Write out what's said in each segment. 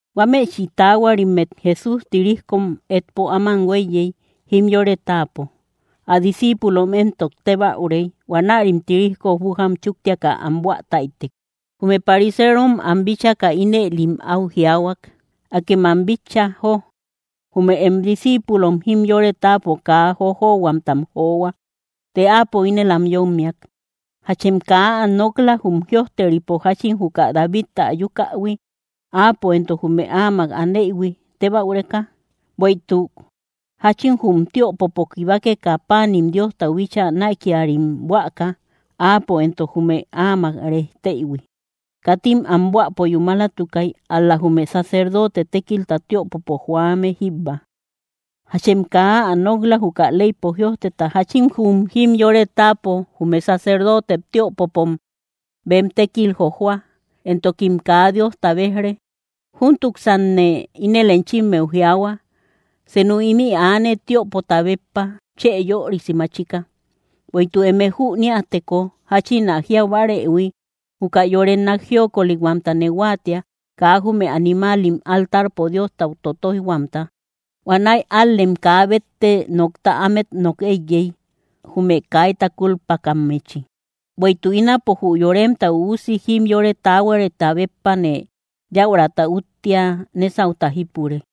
Huámëchi taahuarimmet Jesús tirijkom etpo áman huéiyey jimyore táapo. Ä discíipulom éntok tébäurey; huanärim tirijko bújam chúktiaka am buä táytek. Jume pariserom am bíchaka, ínëlim áu jiaahuak: —¡Akem am bitcha, jó! Jume em discíipulom jimyore táapo kaa jojohuamtam johua. Të Áapo ínel am yómmiak: —¿Jachem kaa ä nok‑la, jum jïojteripo, jáchín juka Davidta ayukähui, áapo éntok jume áamak aneïhui tebäureka? Bueïtuk, ¿jáchin jum tiöpopo kibakeka, páanim Diostau bíchaa näikiarim buäka, áapo entok jume áamak rejteïhui? Katim am buäpo yúmalatukay, ál‑la jume sacerdote tékilta tiöpopo joame jíbba. ¿Jachem kaa ä nok‑la, juka leypo jïojteta, jáchin jum jimyore táapo, jume sacerdotem tiöpopom bem tékil jojoa, entokim kaa Diosta bejre? Júntuksanne ínel enchimmeu jiaahua: Senu ímï aane, tiöpota béppa chë yörisi machika. Bueïtuk eme jüniäteko jáchin ä jiau bárëhui: “Juka yore nák jíokolihuamtane huáatia, kaa jume animaalim altarpo Diostau totoijhuamta”, huanäi ál‑lem kaa bétte nokta ámet nok éiyey, jume kaita kúlpakammechi. Bueïtuk ínapo jü Yoremta Üusi jimyore táhuarita béppane yaurata úttia nesauta jípure.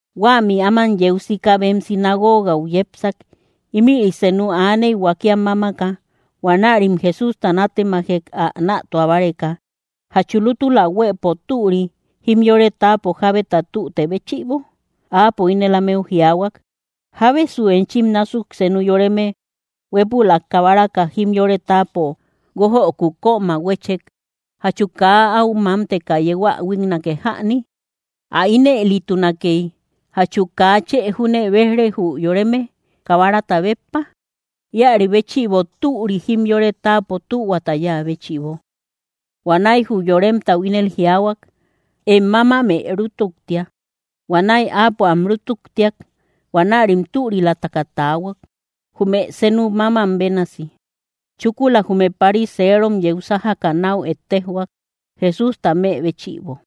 Huämi áman yeu sika bem sinagoogau yepsak. Ímïri senu aaney, huakiam mámaka. Huanärim Jesústa nátemajek, ä nätua báreka: —¿Jachu lútula huëpo türi, jimyore táapo jábeta tüte béchïbo? Áapo ínel ámeu jiaahuak: —¿Jábesu enchim násuk senu yoreme huépülak kabaraka, jimyore táapo guójöku kóm ä huéchek, jachu kaa áu mámteka yeu ä huíknake jäni? Ä ínëlitunakey, ¿jachu kaa chë júne béj‑re jü yoreme, kabarata béppa? Íäri béchïbo, türi jimyore táapo tühuata yáa béchïbo. Huanäi jü yoremtau ínel jiaahuak: —Em mámamë rútuktia. Huanäi áapo am rútuktiak; huanärim türilataka taahuak, jume senu mámam bénasi. Chúkula jume pariserom yeu sájaka, náu ettejhuak, Jesústa më béchïbo.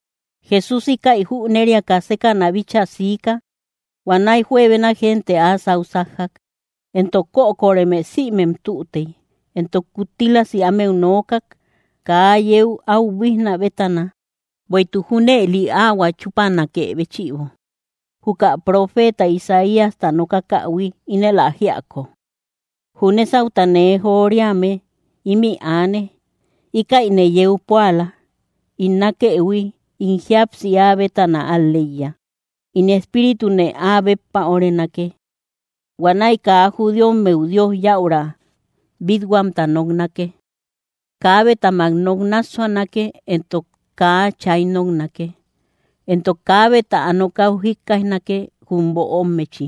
Jesús íkäi jüneriaka, sékäna bíchaa siika. Huanäi juebena gente áa sáu sájjak, entok kökoreme sïmem tütey, entok kuttílasi ámeu nookak, kaa yeu áu buíjnä bétana. Bueïtuk junëli áhuä chúpanakë béchïbo, juka profeeta Isaíasta nokakähui, ínel ä jíako: Jü nésauta nee joriame ímï aane; íkäine yeu púala, ín nákëhui; ín jíapsi áa bétana al‑leiya; ín Espíritune áa béppa órenake. Huanäi kaa judíommeu Dios yäura bít-huamta noknake. Kaabetamak nok náassuanake, entok kaa chay noknake, entok kaabe ä nokäu jikkaijnake, jum böommechi.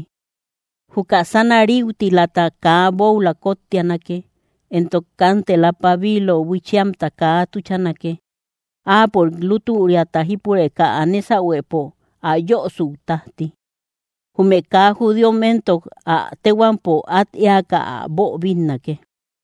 Juka sána ríutilata kaa bóula kóttianake, entok kántela pabiilo buiichiamta kaa tuchanake, áapörik lútüriata jípureka ä nésahuepo ä yosüu tájti. Jume kaa judíom éntok, ä téhuampom át éaka ä boobinnake.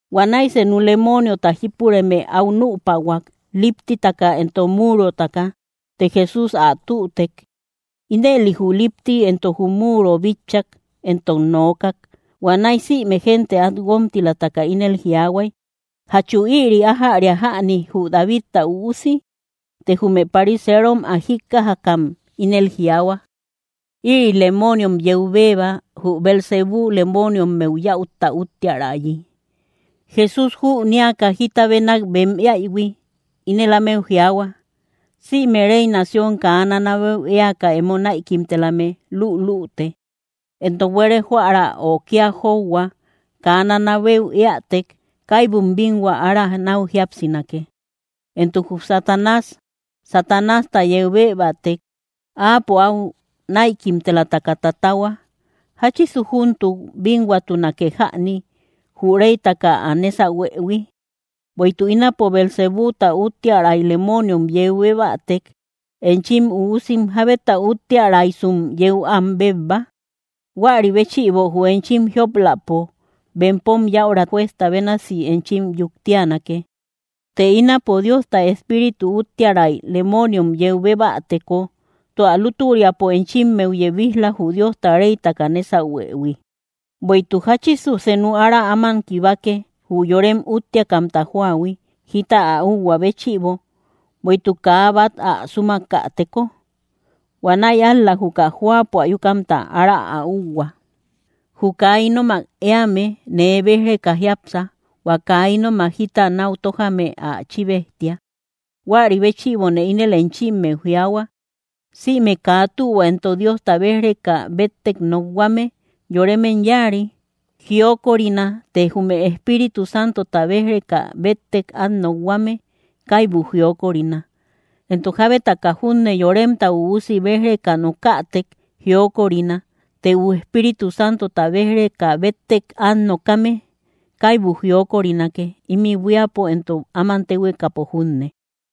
Huanäi senu lemooniota jípureme áu nüpahuak, líptitaka entok múurotaka; të Jesús ä tütek. Ínëli jü lípti entok múuro bitchak, entok nookak. Huanäi sïme gente át guómtilataka ínel jiaahuay: —¿Jachu ïri ájäria jäni jü Davidta Üusi? Të jume pariserom ä jíkkajakam ínel jiaahua: —Ïri lemooniom yeu bébba, jü Beelzebú lemooniommeu yäutta úttiärayi. Jesús jünéaka jita bénak bem éaïhui, ínel ámeu jiaahua: —Sïme réy nación kaa nanabeu éaka emo näikimtelame lülüte, entok buére jóära ö kía jóuhua kaa nanabeu éätek, kaibum bínhua ára náu jíapsinake. Entok jü Satanás, Satanásta yeu bébätek, áapo áu näikimtelataka tatahua. ¿Jáchisu júntuk bínhuatunake jäni, jü réytaka ä nésahuëhui? Bueïtuk ínapo Beelzebúta úttiäray lemooniom yeu bébätek, enchim üusim, ¿jábeta úttiäraysum yeu am bébba? Huäri béchïbo, jü enchim jiop‑läpo, bempom yäura juezta bénasi enchim yuktianake. Të ínapo Diosta Espíritu úttiäray lemooniom yeu bébäteko, tua lútüriapo enchimmeu yebij‑la, jü Diosta réytaka nésahuëhui. ’Bueïtuk, ¿jáchisu senu ára áman kibake, jü yorem úttiakamta jóahui, jita ä úhuä béchïbo, bueïtuk kaa bát ä súmakäteko? Huanäi ál‑la juka jóapo ayukamta ára ä úuhua. ’Jü kaa ínomak éame, nee béj‑reka jiápsa; hua kaa ínomak jita náu tójame, ä chíbejtia. ’Huäri béchïbone ínel enchimmeu jiaahua, sïme kaa tühua entok Diosta béj‑reka béttek nokhuame yoremem yáari, jiokorina; të jume Espíritu Santota béj‑reka béttek át nokhuame kaibu jiokorina. Entok jábetaka junne Yoremta Üusi béj‑reka nokakätek jiokorina; të jü Espíritu Santota béj‑reka béttek át nokame, kaibu jiokorinake, ímï buíapo entok áman téhuekapo junne.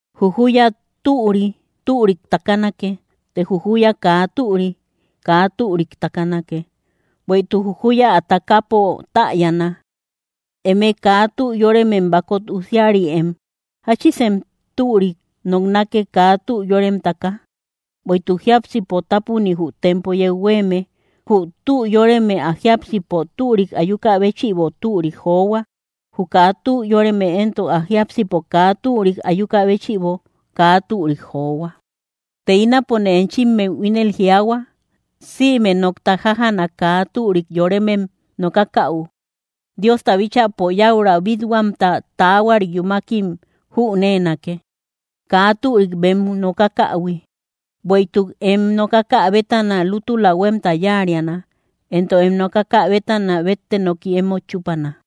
’Jü júya türi, türik takanake. Të jü júya kaa türi, kaa türik takanake; bueïtuk jü júya ä takäpo täyana. ¡Eme kaa tü yóremem bakot usiarïem! ¿Jáchisem türik noknake, kaa tü yórememtaka? Bueïtuk jiápsipo tápuni jü tempo yeu huéeme. Jü tü yóreme ä jiápsipo türik ayukä béchïbo türik johua; jü kaa tü yóreme éntok, ä jiápsipo kaa türik ayukä béchïbo kaa türik johua. Të ínapone enchimmeu ínel jiaahua, sïme nokta jájana kaa türik yoremem nokakäu, Diosta bíchäpo yäura bít-huamta taahuari yúmakim jüneenake, kaa türik bem nokakähui. Bueïtuk em nokakä bétana lútula huémta yáariana, entok em nokakä bétana bétte noki emót chúpana.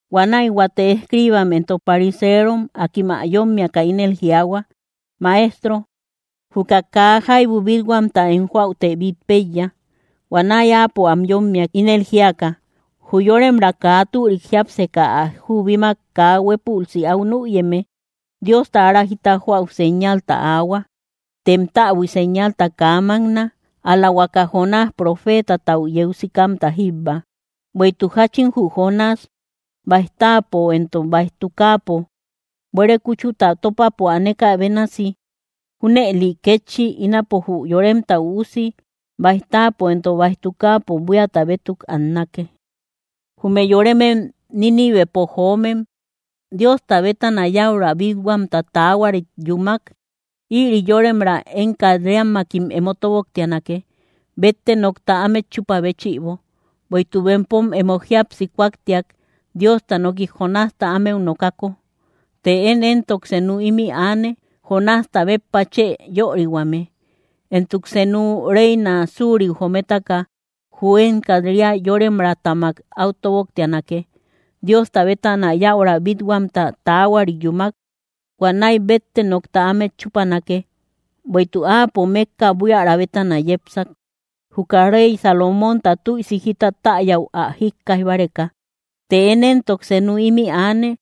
Huanäi huate escriibam entok pariserom akim ä yómmiaka ínel jiaahua: —Maestro, juka kaa jaibu bít-huamta em joäute bít péiya. Huanäi Áapo am yómmiak, ínel jíaka: —Jü yóremraa kaa türik jiápseka ä jubimak kaa huépülsi áu nüyeme, Diosta ára jita joäu señalta aahua; tem täbui señalta kaa mákna, ál‑la huaka Jonás profeetatau yeu sikamta jíbba. Bueïtuk jáchin jü Jonás báij táapo entok báij tukaapo buére kúchuta tópapo anekä bénasi, junëli kétchi ínapo jü Yoremta Üusi báij táapo entok báij tukaapo buíata bétuk annake. Jume yoremem Nínivepo joomem, Diosta bétana yäura bít-huamta taahuarit yúmak, ïri yóremraa én kat‑riammakim emo tóboktianake, bétte nokta ámet chúpä béchïbo; bueïtuk bempom emo jíapsi kúaktiak, Diosta noki Jonásta ámeu nokako. Të én éntok senu ímï aane, Jonásta béppa chë yörihuame. Entok senu reina suriu jometaka, jü én kat‑ria yóremraatamak áu tóboktianake, Diosta bétana yäura bít-huamta taahuari yúmak, huanäi bétte nokta ámet chúpanake; bueïtuk áapo mékka buiära bétana yepsak, juka rey Salomónta tüisi jita täyäu ä jíkkaij báreka; të én éntok senu ímï aane,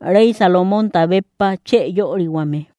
rey Salomónta béppa chë yörihuame.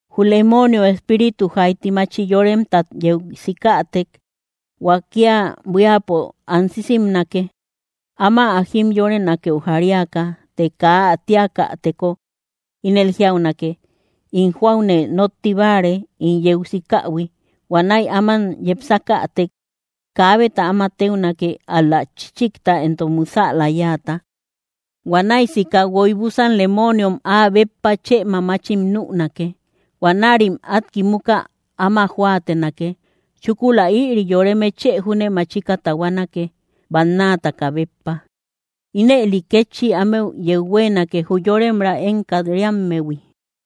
’Jü lemoonio espíritu jaiti machi yoremtat yeu sikätek, huakia buíapo ansisimnake, áma ä jimyorenakeu jariaka; të kaa ä tíakäteko, ínel jiaunake: “In jóaune nótti báare, ín yeu sikähui.” Huanäi áman yepsakätek, kaabeta áma téunake, ál‑la chíchikta entok musäla yáata. Huanäi sika, guoy búsan lemooniom áa béppa chë mamachim nünake. Huanärim át kimuka áma jóatenake. Chúkula ïri yoreme chë júne machika tahuanake, bannaataka béppa. Ínëli kétchi ámeu yeu huéenake, jü yóremraa én kat‑riammehui.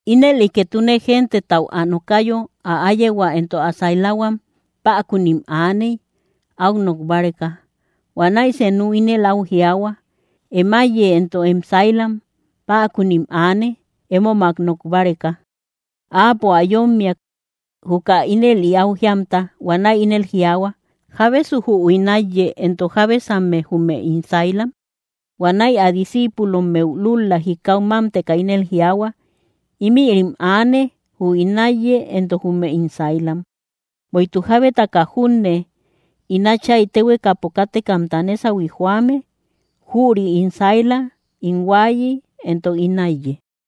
Ínëli ketune gentetau ä nokayo, ä áyehua entok ä sailahuam päkunim aaney, áu nok báreka. Huanäi senu ínel áu jiaahua: —Em áiye entok em sailam päkunim aane, émomak nok báreka. Áapo ä yómmiak, juka ínëli áu jíamta. Huanäi ínel jiaahua: —¿Jábesu jü ín áiye? Entok, ¿jábesamme, jume ín sailam? Huanäi ä discíipulommeu lúl‑la jikau mámteka, ínel jiaahua: —Ímïrim aane, jü ín áiye entok jume ín sailam. Bueïtuk jábetaka junne ín Áchay téhuekapo kátekamta nésahui joame, jüri ín saila, ín huaayi, entok ín áiye.